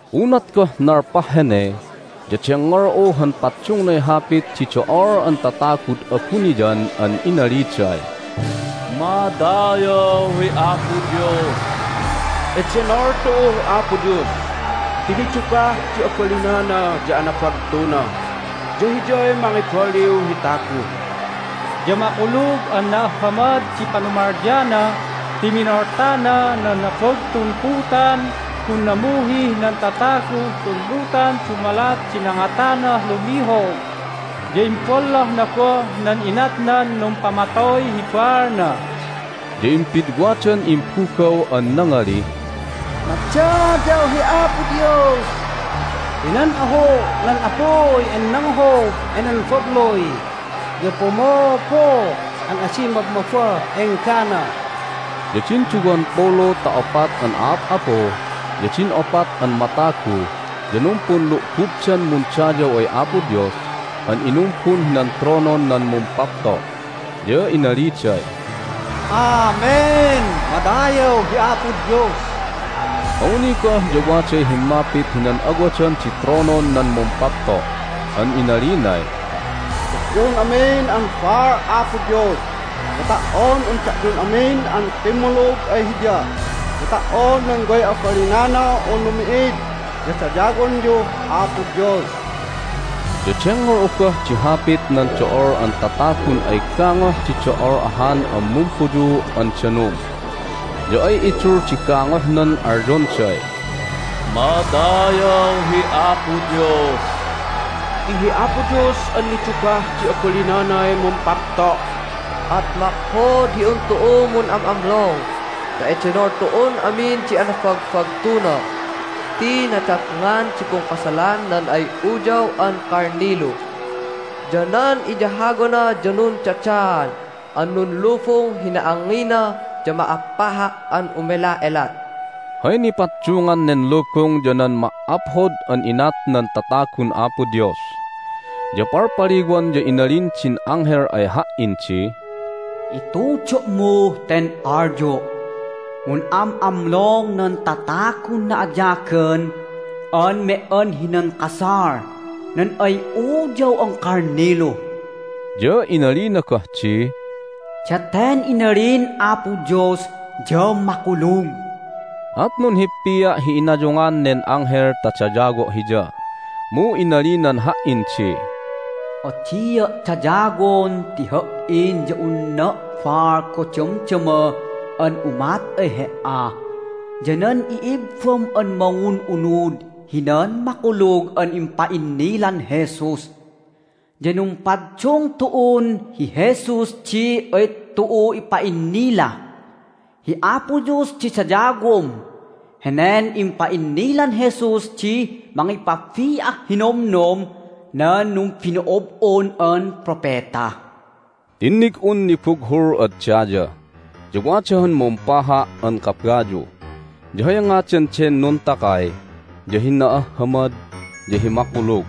Unat goh nalpah hene ya dengngol'u han paddungnay hapit di do'ol an tatagud abuniyan an inaliday, "Madayaw hi Apo Dios! Edenol tu'uh Apo Dios ti nidugah di abalinana ya anabagtuna, ya Hiyay mangibaliw hi tagu! Ya makulug an na'ahhamad di panumalyana ti minoltana nan nabagtun putan gun namuhih nan tataguh tun lutan dumalat di nangatanah lumihog, ya imbollohna goh nan inatnan numpamatoy hi baalna!" Ya impidwadan imbugaw an nangalih, "Madayaw hi Apo Dios! Ti nan ahu' nan apuy an nanghob enen babluy ya pumuupuuh an adi mabmabbah enggana!" Ya din duwampulu ta opat an a'ap'apu ya din opat an matagu ya numpunlu'bubdan mundayaw ay Apo Dios an inumbun hinan tronon nan Mumpapto', ya inaliday, "Amen! Madayaw hi Apo Dios!" Awni goh ya waday himmapit hinan awadan di tronon nan Mumpapto' an inalinay, "Da'yun amin an baal Apo Dios, ya ta"on un da'yun amin an kimmulug ay Hiya, ya ta"on nan way abalinana unu mi'id ya dayawonyuh Apo Dios!" Ya dengngol'u goh di hapit nan do'ol an tatagun ay gangoh di do'ol ahan an pumpuyuu' an danum, ya ay idul di gangohnan alyonday, "Madayaw hi Apo Dios! Ti hi Apo Dios an nidugah di abalinanay mumpapto'! At maphod hi un tu'u mun'am'amlong ta edenol tu'un amin di anabagbagtuna ti nadatngan di pungkasalan nan ay Uyaw an Kalnilu. Ya nan iyahawana ya nundadaan an nunlubung hi na'angngina ya ma'appaha' an umela'elat." (Hay nipaddungan nen lubung ya nan ma"aphod an inat nan tatagun Apo Dios.) Ya palpaliwan ya inalin din anghel ay ha"in di, "Itudo'muh ten alyo': Mun'am'amlong nan tatagun na'ayagan an me"an hinan kasal nan ay Uyaw an Kalnilu!" Ya inalina goh di, "Daten inalin Apo Dios ya makulug." At nunhippia' hi inayungan nen anghel ta dayawo' hiya, mu inalinan ha"in di, "Adia' dayawon ti ha"in ya unna' baal goh damdama an umat ay he"a ya nan i'ibbam an mangun'unud hinan makulug an impa'innilan Jesus! Ya numpaddung tu'un hi Jesus di ay tu'u ipa'innila. Hi Apo Dios di dayawom! Henen impa'innilan Jesus di mangipabi'ah hi nomnom nan numbino'ob'on an propeta." Tinnig'un nibughul ad daya, ya wada han mumpaha' an kabayu. Ya hay ngadan den nuntakay ya hi Na'ahhamad ya hi Makulug.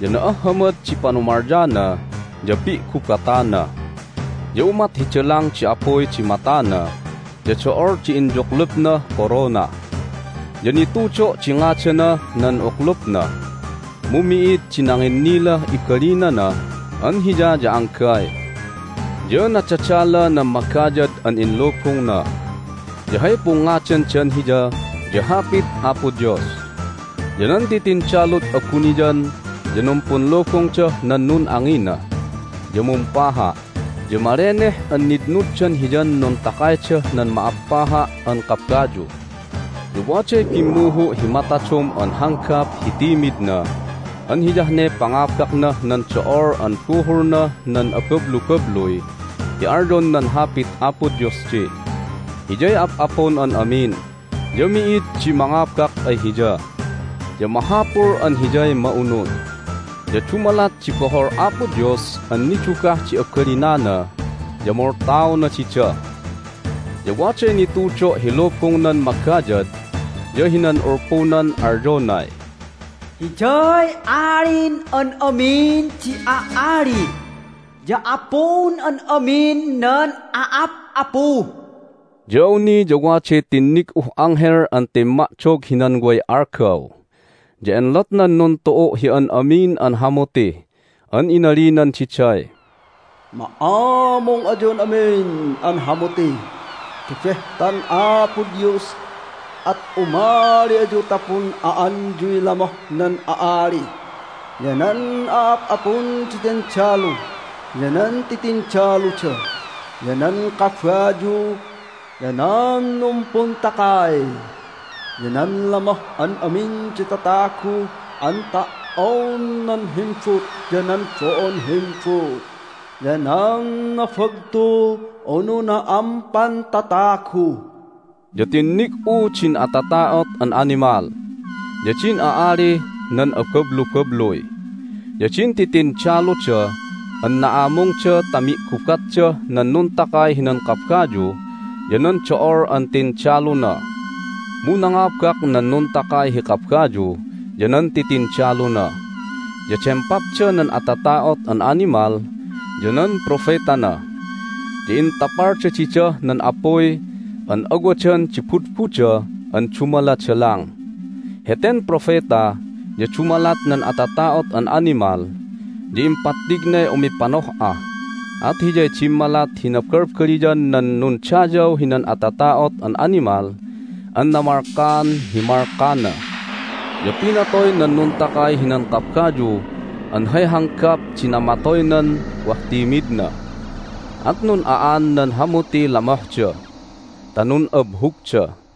Ya na'ahhamad di panumalyana ya pi'gubatana. Ya umat hi dalang di apuy di matana, ya do'ol di inyuklupnah korona. Ya nitudo' di ngadanah nan uklupna, mu mi'id di nanginnilah ibalinana an Hiya ya anggay. Ya nadadala nan magayad an inlubungna, ya hay pungngadandan Hiya ya Hapit Apo Dios. Ya nan titindalud abuniyan ya numpunlubungdah nan nun'angina, ya mumpaha', ya maleneh an nitnuddan Hiyan nuntakaydah nan ma'appaha' an kabayu. Ya waday bimmuhu' hi matadom an hanggap hi timidna an hiyah ne pangabaknah nan do'ol an buhulnah nan abablubabluy ti alyon nan Hapit Apo Dios di, "Hiyay ap'apun an amin, ya mi'id di mangabak ay Hiya, ya mahapul an Hiyay ma'unud." Ya dumalat di bohol Apo Dios an nidugah di abalinana ya moltaona dida. Ya waday nitudo' hi lubungnan magayad ya hinan ulpunan alyonay, "Hiyay Alin an Amin di A'ali, ya Apun an Amin nan A'ap'apu." Ya awni ya waday tinnig'uh anghel an timma'dog hinan way algaw. Ya enlotnan nuntu'u' hi an amin an hamuti an inalinan diday, "Ma'amung ayun amin an hamuti ti behtan Apo Dios! At umali ayu ta pun'a'anyuy lamoh nan a'ali, ya nan a'ap'apun di tindalu, ya nan titindaluda, ya nan kabayu, ya nan numpuntakay, ya nan lamoh an amin di tatagu an ta"on nan himbut, ya nan bo'on himbut, ya nan nabagtu, unu na'ampan tatagu!" Ya tinnig'u din atata'ot an animal, ya din a'alih nan abablubabluy, ya din titindaluda an na'amungda ta mi'gubatdah nan nuntakay hinan kabayu ya nan do'ol an tindaluna. Mu nangabak nan nuntakay hi kabayu ya nan titindaluna. Ya dempapda nan atata'ot an animal ya nan propetana, ya intapalda didah nan apuy an awadan di budbuda an dumaladalang. Heten propeta ya dumalat nan atata'ot an animal ya impattignay umipanoh'a, at hiyay dimmalat hi nabalbaliyan nan nundayaw hinan atata'ot an animal an namalkaan hi malkana. Ya pinatoy nan nuntakay hinan kabayu an hay hanggap di namatoynan wah timidna, at nun'a'an nan hamutiy lamohda ta nun'abhugda.